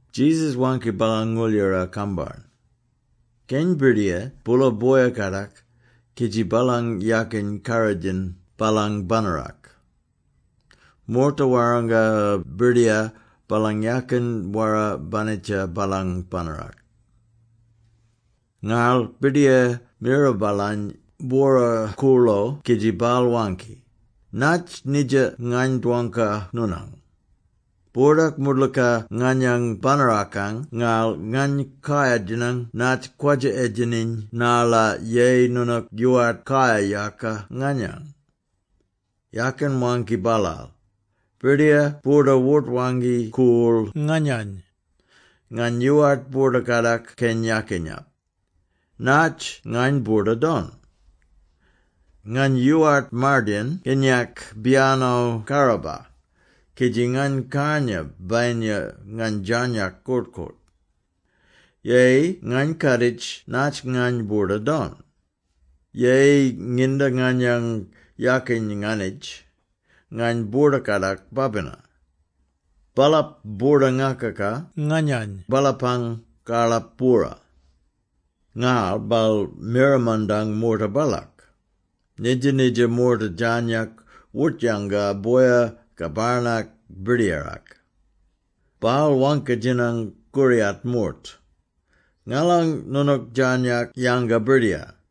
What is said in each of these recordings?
Jesus waangki baalang ngooldjara-kambarn, “Keny birdiyar boola boya-kadak kidji baalang yakin karrodjin baalang banarak. Moorta warranga birdiyar baalang yakin wara-banitja baalang banarak Ngarl birdiyar mira baalany bwora-koorlo kidji baal waangki, ‘Natj nidja ngany dwangka noonang? Boordak moodlooka nganyang banarakang ngarl ngany kayar-djinang natj kwadja-edjeniny narla yeyi noonook yoowart kayar-yaka nganyang.’ Yakin waangki baalaal, ‘Birdiyar boorda wort-waangki-koorl nganyany. Ngany yoowart boorda-kadak keny yakinyap. Natj ngany boorda-don? Ngany yoowart mardayin kinyak biyano karraba, kidji ngany karnya bayinya ngany djarnyak koort-koort. Yeyi ngany kaaditji natj ngany boorda-don! Yeyi nginda nganyang yakiny nganitj, ngany boorda-kadak babina. Baalap boorda-ngakaka nganyany baalapang karlap-bwora.’ Ngarl baal mira mandang moorta baalak. Nidja-nidja moorta djarnyak wort-yanga boya ka barnak birdiyarak. Baal waangki-djinang koriyat moort, ‘Ngalan noonook djarnyak yanga birdiyar?’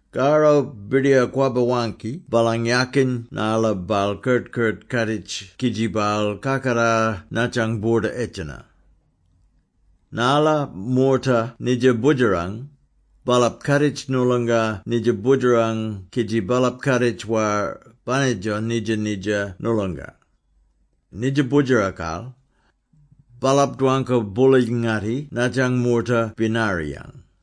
“Karro birdiyar kwabba-waangki baalang yakin narla baal kert-kert kaaditji kidji baal kakatar nadjang boorda-edjena. Narla moorta nidja Boodjerang, baalap kaaditj noolonga nidja Boodjerang kidji baalap kaaditj war banitjo nidja-nidja noolonga. Nidja Boodjerakal, baalap dwangka-boola-ngatti nadjang moorta binariyang.”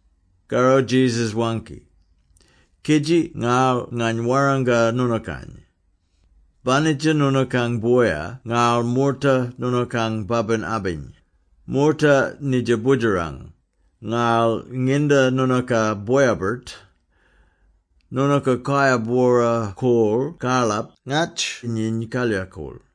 Karro Jesus waangki, “Kidji ngarl ngany warranga noonookany: banitja noonookang boya ngarl moorta noonookang babin-abiny, moorta nidja Boodjerang, ngarl nginda noonooka boya-birt, noonooka kayar-bwora-koorl karlap ngatj nyiny kalyakool.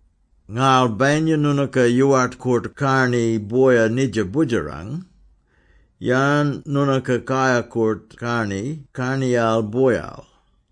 Ngarl bayinya noonooka yoowart koort-karni boyal nidja Boodjerang, yarn noonooka kayar-koort-karni karniyal boyal?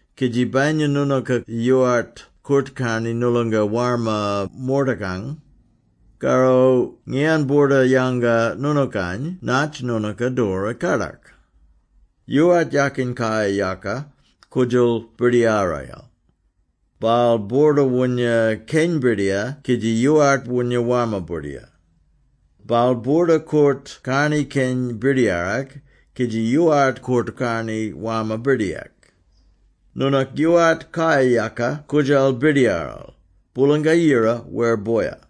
Kidji bayinya noonooka yoowart koort-karni noolonga warma moortakang, karro ngiyan boorda-yanga noonookany natj noonooka doora kadak? “Yoowart yakin kayar-yaka koodjal birdiyarayel. Baal boorda-woonya keny birdiyar kidji yoowart woonya warma birdiyar; baal boorda koort-karni keny birdiyarak kidji yoowart koort-karni warma birdiyarak. Noonook yoowart kayar-yaka koodjal birdiyaral, Boolanga-Yira wer boya.”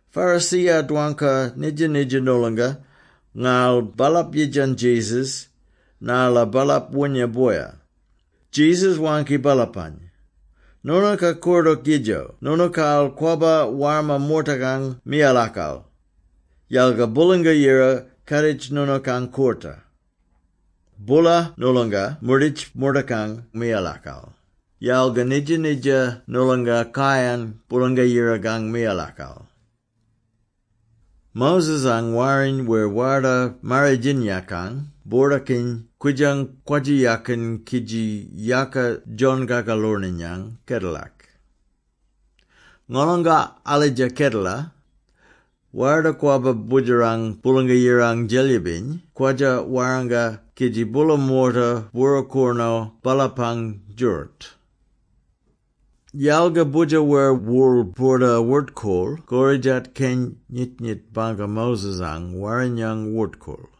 Pharisee-ya dwangka nidja-nidja noolonga, ngarl baalap yidjan Jesus, narla baalap woonya boya. Jesus waangki baalapany, “Noonooka koordook yidjo noonookaal kwabba warma moortakang miyalakal, yalga Boolanga-Yira kaaditj noonookang koorta. Boola noolonga moorditj moortakang miyalakal, yalga nidja-nidja noolonga kayan Boolanga-Yirakang miyalakal. “Moses-ang Warriny wer Warda-Marridjinyakang boordakiny kwidjang kwadja-yakiny kidji yaka John-Kakaloorniyang kedelak. Ngolonga alidja kedela, Warda-Kwabba Boodjerang Boolanga-Yirang Djelyibiny kwadja warranga kidji boola moorta bwora-koornoo baalapang djooroot. Yalga Boodjer wer Worl boorda-wort-koorl koridjat keny nyit-nyit bangka Moses-ang Warrinyang wort-koorl.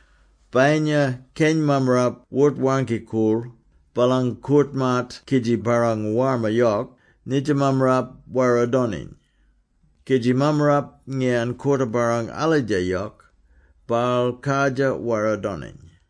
“Bayinya keny mammarap wort-waangki-koorl baalang koort-maat kidji barrang warma yok, nidja mammarap wara-doniny; kidji mammarap ngiyan koorta-barrang alidja yok, baal kardjir wara-doniny.”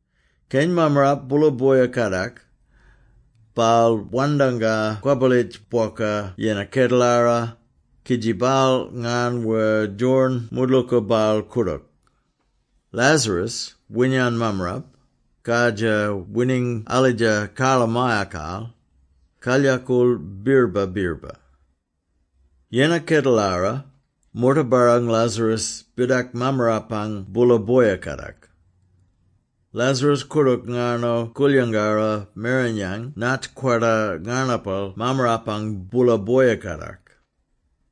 “Keny mammarap boola boya-kadak. Baal wandanga kwabbalitj bwoka yennar kedelara, kidji baal ngarn wer djorin moodlooka baal koordook. Lazarus, winyan mammarap, kardjir wining alidja karlamayakal, kalyakool birrba-birrba. Yennar kedelara, moorta barrang Lazarus bidak mammarapang boola boya-kadak. Lazarus koordook ngarno koolyangarra merenyang natj kwarda ngarnapal mammarapang boola boya-kadak.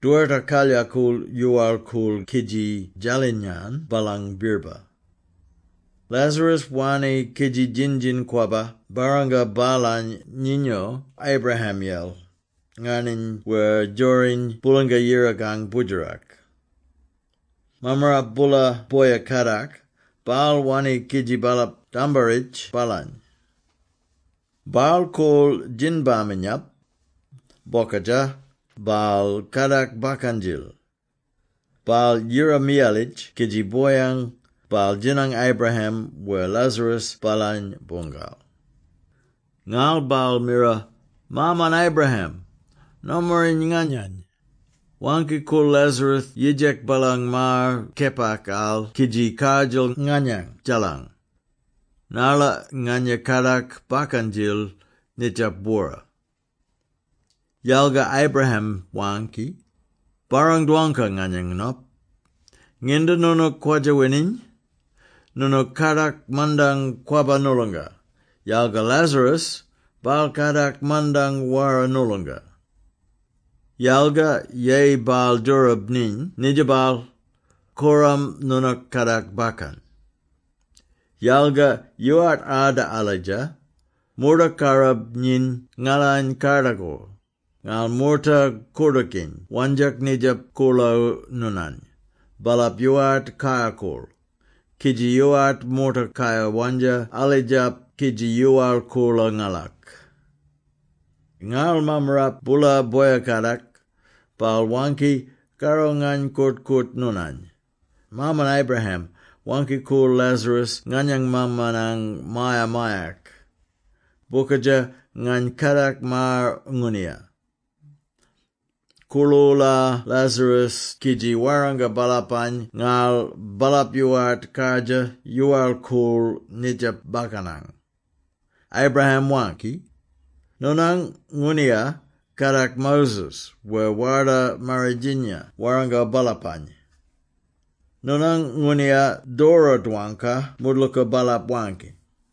Dwerta kalyakool yoowal-koorl kidji djalinyan baalang birrba. Lazarus wanni kidji djin-djin-kwabba barranga baalany nyinyo Abraham-yel, ngarniny wer djoriny Boolanga-Yirakang Boodjerak. Mammarap boola boya-kadak, baal wanni kidji baalap dambarritj baalany. Baal koorl Djinbaminyap. Bokadja, baal kadak bakkan-djil. Baal yira-miyalitj kidji boyang, baal djinang Abraham wer Lazarus baalany boongal. Ngarl baal mira, ‘Maaman Abraham! Nomaring nganyany! Waangki-koorl Lazarus yidjak baalang maar kepakal kidji kardjal nganyang djaalang, narla nganya kadak bakkan-djil nidjap bwora!’ Yalga Abraham waangki, ‘Barrang-dwangka, nganyang nop, nginda noonook kwadja-wining, noonook kadak mandang kwabba noolonga, yalga Lazarus, baal kadak mandang wara noolonga. Yalga yeyi baal djoorab nyiny nidjapal, korram noonook kadak bakkan. Yalga yoowart arda alidja, moordak karrab nyiny ngalany kardakor, ngarl moorta koordookiny wandjak nidjap koorlo noonany, baalap yoowart kayar-koorl; kidji yoowart moorta kayar-wandja alidjap kidji yoowal-koolo ngalak.’ “Ngarl mammarap boola boya-kadak, baal waangki, ‘Karro ngany koort-koort noonany, Maaman Abraham, waangki-koorl Lazarus nganyang maamanang maya-mayak. Bokadja, ngany kadak maar ngooniya. Koorl-oola Lazarus kidji warranga baalapany ngarl baalap yoowart kardjir yoowal-koorl nidjap bakkanang.’ Abraham waangki, ‘Noonang ngooniya kadak Moses wer Warda Marridjinya warrango baalapany. Noonang ngooniya doora-dwangka moodlooka baalap waangki.’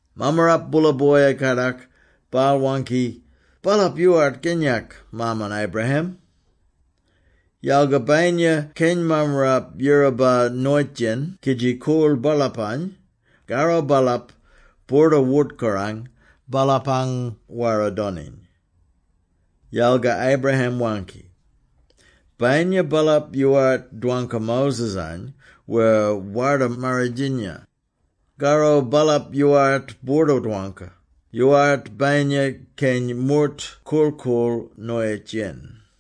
Mammarap boola boya-kadak, baal waangki, ‘Baalap yoowart kinyak, Maaman Abraham! Yalga bayinya keny mammarap yiraba noyitj-yen kidji koorl baalapany, karro baalap boorda-wort-korang baalapang wara-doniny.’ Yalga Abraham waangki, ‘Bayinya baalap yoowart dwangka Moses-any wer Warda-Marridjinya, karro baalap yoowart boorda-dwangka, yoowart bayinya keny moort korl-koorl noyitj-yen.’”